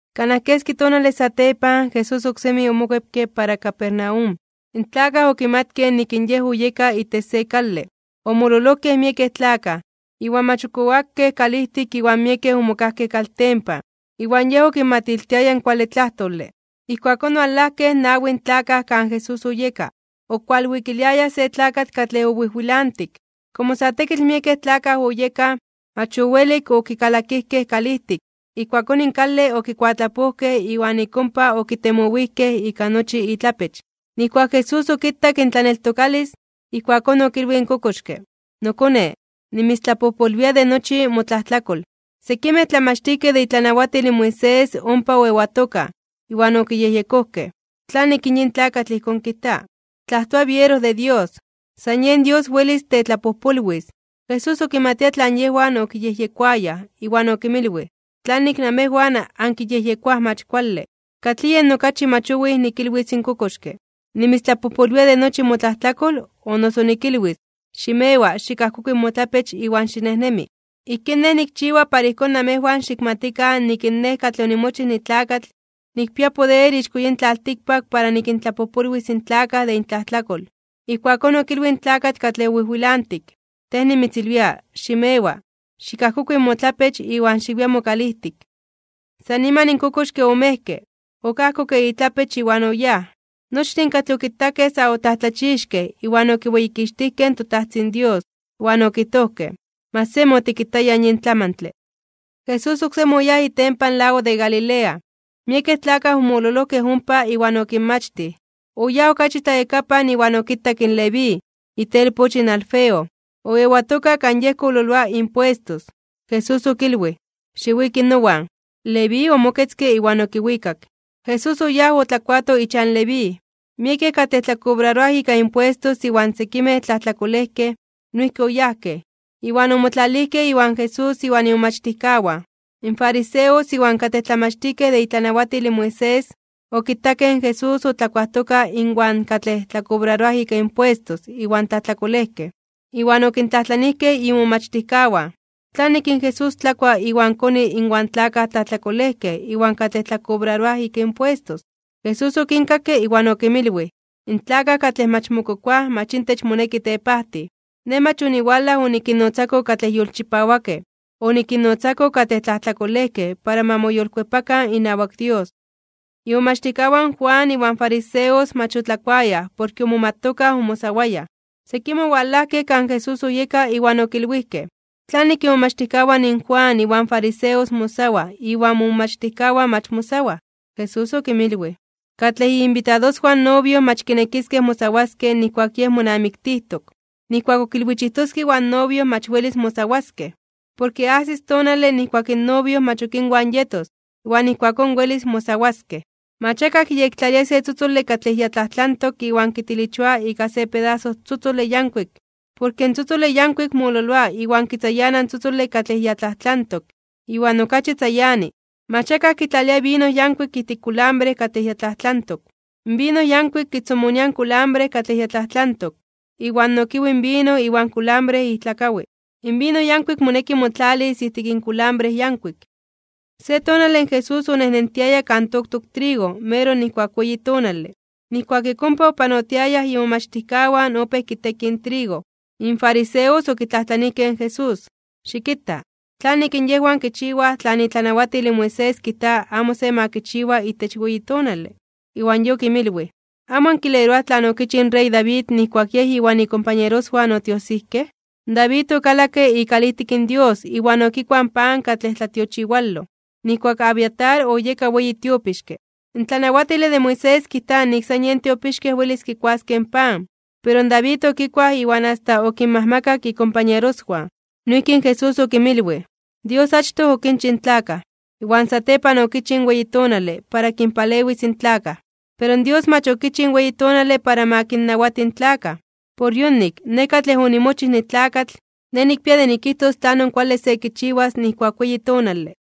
Kanaj keski tonale satepan, Jesús oksemi omokuepke para Capernaum. In tlakaj okimatkej nik in Yej oyeka itech se kale. Omololojkej miekej tlakaj, iwan mach ok oakej kalijtik iwan miekej omokajkej kaltempan, iwan Yej okinmatiltiaya in kuale tlajtole. Ijkuakón owalajkej nawin tlakaj kan Jesús oyeka, okualwikiliayaj se tlakatl katlej owijwilantik. Komo sa tekitl miekej tlakaj oyekaj, mach owelik okikalakijkej kalijtik. Ijkuakón in kale okikuatlapojkej iwan ik ompa okitemowijkej ika nochi itlapech. Nijkuak Jesús okitak intlaneltokalis, ijkuakón okilwij in kokoxke: ―Nokone, nimitztlapojpolwia de nochi motlajtlakol. Sekimej tlamachtijkej de itlanawatil in Moisés ompa oewatokaj, iwan okiyejyekojkej: “¿Tlanik yin tlakatl ijkón kijta? Tlajtoa biero de Dios. San yen Dios welis tetlapojpolwis.” Jesús okimatia tlan yejwan okiyejyekoayaj, iwan okinmilwij: ―¿Tlanik namejwan ankiyejyekoaj mach kuale? ¿Katlij yen okachi mach owij nikilwis in kokoxke: “Nimitztlapojpolwia de nochi motlajtlakol”, o noso nikilwis: “Ximewa. Xikajkokui motlapech iwan xinejnemi”? Ijkín Nej nikchiwa para ijkón namejwan xikmatikan nik in Nej katlej onimochij nitlakatl, nikpia poder ixko yin tlaltikpak para nikintlapojpolwis in tlakaj de intlajtlakol. Ijkuakón okilwij in tlakatl katlej owijwilantik: ―Tej nimitzilwia, ximewa, xikajkokui motlapech iwan xiwia mokalijtik. San niman in kokoxke omejke, okajkokke itlapech iwan oyáj. Nochtin katlej okitakej sa otlajtlachixkej (omomajmawtijkej) iwan okiweyikixtijkej in toTajtzin Dios, iwan okijtojkej: ―¡Mach semi otikitayaj yin tlamantle! Jesús oksemi oyáj itempan lago de Galilea, miekej tlakaj omololojkej ompa iwan okinmachtij. Oyáj okachi tlayakapan iwan okitak in Leví, itelpoch in Alfeo, oewatoka kan yej kololoa impuestos. Jesús okilwij: ―Xiwiki nowan. Leví omoketzke iwan okiwikak. Jesús oyáj otlakuato ichan Leví. Miekej katlej tlakobraroaj ika impuestos iwan sekimej tlajtlakolejkej, noijki oyajkej, iwan omotlalijkej iwan Jesús iwan imomachtijkawan. In fariseos iwan katlej tlamachtijkej de itlanawatil in Moisés, okitakej in Jesús otlakuajtoka inwan katlej tlakobraroaj ika impuestos iwan tlajtlakolejkej, iwan okintlajtlanijkej imomachtijkawan: ―¿Tlanik in Jesús tlakua iwan koni inwan tlakaj tlajtlakolejkej iwan katlej tlakobraroaj ika impuestos? Jesús okinkakke iwan okinmilwij: ―In tlakaj katlej mach mokokoaj mach intech moneki tepajtij. Nej mach oniwalaj onikinnotzako katlej yolchipawakej, onikinnotzako katlej tlajtlakolejkej para ma moyolkuepakan inawak Dios. Imomachtijkawan in Juan iwan fariseos mach otlakuayaj porke omomatokaj omosawayaj. Sekimej owalajkej kan Jesús oyeka iwan okilwijkej: ―¿Tlanik imomachtijkawan in Juan iwan fariseos mosawaj iwan momomachtijkawan mach mosawaj? Jesús okinmilwij: ―Katlej iinbitadoswan in novio mach kinekiskej mosawaskej nijkuak yej monamiktijtok, nijkuak ok ilwichijtoskej iwan novio mach welis mosawaskej. Porke ajsis tonale nijkuak in novio mach ok inwan yetos, iwan ijkuakón welis mosawaskej. Mach akaj kiyektlalia se tzotzole katlej ya tlajtlantok iwan kitilichoa ika se pedaso tzotzole yankuik, porke in tzotzole yankuik mololoa iwan kitzayana in tzotzole katlej ya tlajtlantok, iwan okachi tzayani. Mach akaj kitlalia vino yankuik ijtik kulambre katlej ya tlajtlantok. In vino yankuik kitzomonia in kulambre katlej ya tlajtlantok, iwan nokiwi in vino iwan kulambre ijtlakawi. In vino yankuik moneki motlalis ijtik in kulambre yankuik. Se tonale Jesús onejnentiaya kan toktok trigo meroj nijkuak weyi tonale. Nijkuak ik ompa opanotiayaj imomachtijkawan opéj kitekij in trigo. In fariseos okitlajtlanijkej in Jesús: ―Xikita, ¿tlanik in yejwan kichiwaj tlan itlanawatil in Moisés kijta amo se ma kichiwa itech weyi tonale? Iwan Yej okinmilwij: ―¿Amo ankileroaj tlan okichij in rey David nijkuak yej iwan ikompañeroswan otiojsijkej? David okalakke ikalijtik in Dios iwan okikuaj in pan katlej tlatiochiwaloj, nijkuak Abiatar oyeka weyi tiopixke. In tlanawatile de Moisés kijta nik san yen tiopixkej welis kikuaskej in pan, pero in David okikuaj iwan asta okinmajmakak ikompañeroswan. Noijki in Jesús okinmilwij: ―Dios achtoj okinchij in tlakaj, iwan satepan okichij in weyi tonale para kinpalewis in tlakaj. Pero Dios mach okichij in weyi tonale para ma kinnawati in tlakaj. Por yonik, Nej katlej onimochij nitlakatl, Nej nikpia de nikijtos tlanon kuale se kichiwas nijkuak weyi tonale.